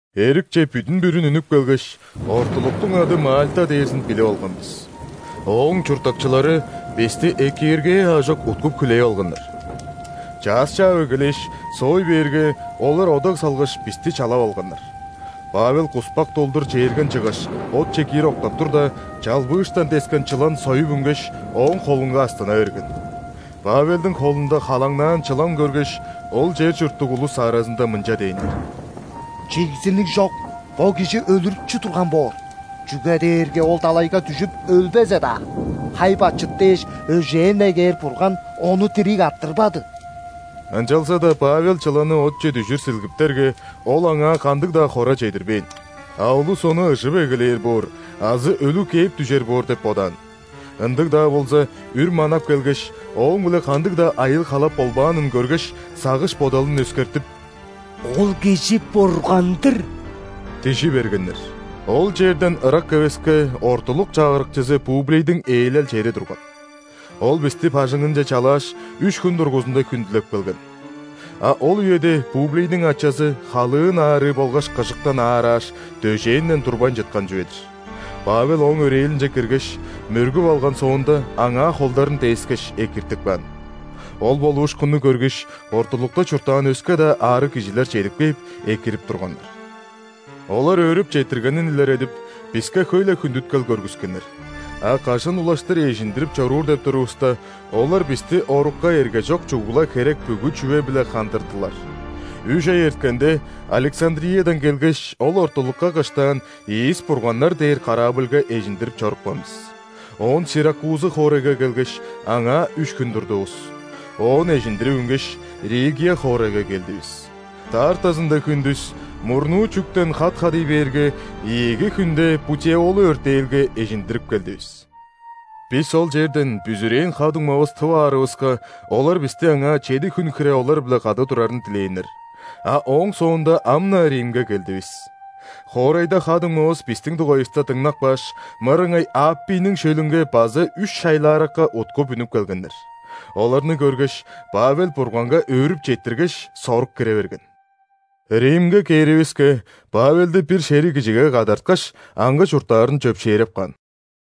Эрикче бүдүн-бүрүн үнүп келгеш, ортулуктуң ады Мальта дээрзин билип алган бис. Ооң чурттакчылары бисти экииргээ аажок уткуп-хүлээп алганнар. Чаъс чаап эгелээш, соой бээрге, олар одаг салгаш, бисти чалап алганнар. Павел куспак долдур чээрген чыггаш, отче киир октап турда, чалбыыштан дескен чылан союп үнгеш, ооң холунга астына берген. Павелдиң холунда халаңнаан чылан көргеш, ол чер чурттуг улус аразында мынча дээннер: «Чигзиниг чок, бо кижи өлүрүкчү турган боор, чүге дээрге ол далайга дүжүп өлбезе-даа, хай-бачыт дээш өжээн негээр бурган ону дириг арттырбады». Ынчалза-даа Павел чыланны отче дүжүр силгиптерге, ол аңаа кандыг-даа хора чедирбээн. А улус ону ыжып эгелээр боор азы өлүг кээп дүжер боор деп бодаан. Ындыг-даа болза, үр манап келгеш, ооң-биле кандыг-даа айыыл-халап болбаанын көргеш, сагыш-бодалын өскертип: «Ол кижи – бурган-дыр» – дижи бергеннер. Ол черден ырак эвеске ортулук чагырыкчызы Публийниң ээлел чери турган. Ол бисти бажыңынче чалааш, үш хүн дургузунда хүндүлеп келген. А ол үеде Публийниң ачазы халыын аарыы болгаш кыжыктан аарааш, дөжээнден турбайн чыткан чүве-дир. Павел ооң өрээлинче киргеш, мөргүп алган соонда, аңаа холдарын дээскеш, экиртип каан. Ол болуушкунну көргеш, ортулукта чурттаан өске-даа аарыг кижилер чедип кээп, экирип турганнар. Олар өөрүп четтиргенин илередип, биске хөй-ле хүндүткел көргүскеннер, а кажан улаштыр эжиндирип чоруур деп турувуста, олар бисти орукка эргежок чугула херек бүгү чүве-биле хандырдылар. Үш ай эрткенде, Александриядан келгеш, ол ортулукка кыштаан «Ийис бурганнар» дээр корабльга эжиндирип чорупкан бис. Оон Сиракузы хоорайга келгеш, аңаа үш хүн турдувус. Оон эжиндирип үнгеш, Ригия хоорайга келдивис. Даартазында хүндүс мурнуу чүктен хат хадый бээрге, ийиги хүнде Путеолы өртээлге эжиндирип келдивис. Бис ол черден бүзүрээн ха-дуңмавыс тып аарывыска, олар бисти аңаа чеди хүн хире олар-биле кады турарын дилээннер. А ооң соонда ам-на Римге келдивис. Хоорайда ха-дуңмавыс бистиң дугайывыста дыңнап кааш, мырыңай Аппийниң шөлүнге база Үш Шайлааракка уткуп үнүп келгеннер. Оларны көргеш, Павел Бурганга өөрүп четтиргеш, сорук кире берген. Римге кээривиске, Павелди бир шериг кижиге кадарткаш, аңгы чурттаарын чөпшээреп каан.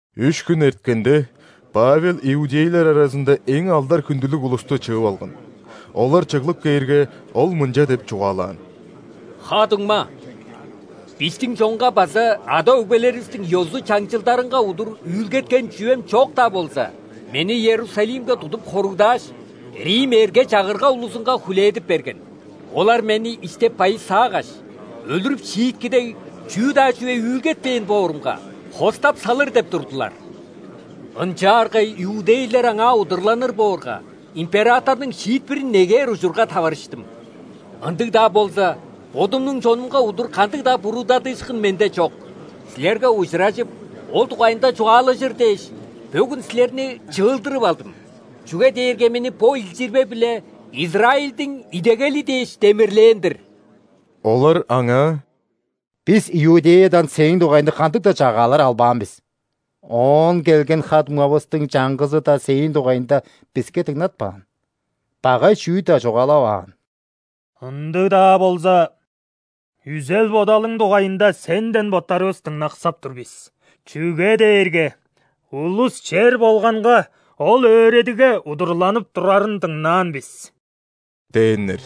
Үш хүн эрткенде, Павел иудейлер аразында эң алдар-хүндүлүг улусту чыып алган. Олар чыглып кээрге, ол мынча деп чугаалаан: «Ха-дуңма! Бистиң чонга база ада-өгбелеривистиң ёзу-чаңчылдарынга удур үүлгеткен чүвем чок-даа болза, мени Иерусалимге тудуп хоругдааш, рим эрге-чагырга улузунга хүлээдип берген. Олар мени истеп байысаагаш, өлүрүп шиитки дег чүү-даа чүве үүлгетпээн боорумга, хостап салыр деп турдулар. Ынчаарга иудейлер аңаа удурланыр боорга, императорнуң шиитпирин негээр ужурга таварыштым, ындыг-даа болза, бодумнуң чонумга удур кандыг-даа буруудадыышкын менде чок. Силерге ужуражып, ол дугайында чугаалажыр дээш, бөгүн силерни чыылдырып алдым, чүге дээрге мени бо илчирбе-биле Израильдиң идегели дээш демирлээн-дир». Олар аңаа: «Бис Иудеядан сээң дугайыңда кандыг-даа чагаалар албаан бис, оон келген ха-дуңмавыстың чаңгызы-даа сээң дугайыңда биске дыңнатпаан, багай чүү-даа чугаалаваан. Ындыг-даа болза, үзел-бодалың дугайында сенден боттарывыс дыңнаксап тур бис, чүге дээрге улус чер болганга ол өөредигге удурланып турарын дыңнаан бис» – дээннер.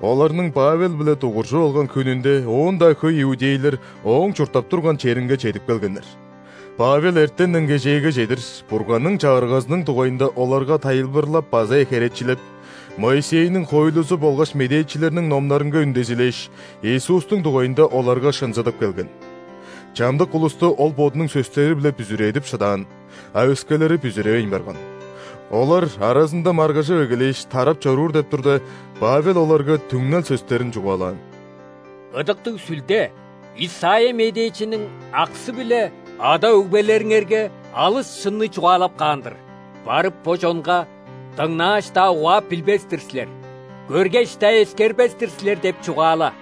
Оларның Павел-биле дугуржуп алган хүнүнде оон-даа хөй иудейлер ооң чурттап турган черинге чедип келгеннер. Павел эртенден кежээге чедир Бурганның Чагыргазының дугайында оларга тайылбырлап база херечилеп, Моисейниң хоойлузу болгаш медээчилерниң номнарынга үндезилээш, Иисустуң дугайында оларга шынзыдып келген. Чамдык улусту ол бодунуң сөстери-биле бүзүредип шыдаан, а өскелери бүзүревейн барган. Олар аразында маргыжып эгелээш, тарап чоруур деп турда, Павел оларга түңнел сөстерин чугаалаан: «Ыдыктыг Сүлде Исайя медээчиниң аксы-биле ада-өгбелериңерге алыс шынны чугаалап каан-дыр: „Барып, бо чонга: ‘Дыңнааш-даа, угаап билбес-тир силер,көргеш-даа, эскербес-тир силер’ – деп чугаала.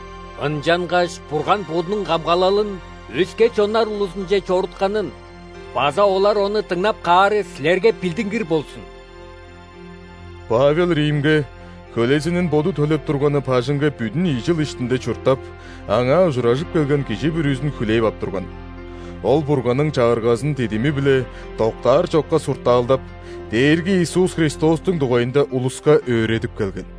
Ынчангаш Бурган Бодунуң камгалалын өске чоннар улузунче чорутканын база олар ону дыңнап каары силерге билдингир болзун!» Павел Римге, хөлезинин боду төлеп турганы бажыңга бүдүн ийи чыл иштинде чурттап, аңаа ужуражып келген кижи бүрүзүн хүлээп ап турган. Ол Бурганның Чагыргазын дидими-биле, доктар чокка суртаалдап, Дээрги Иисус Христостуң дугайында улуска өөредип келген.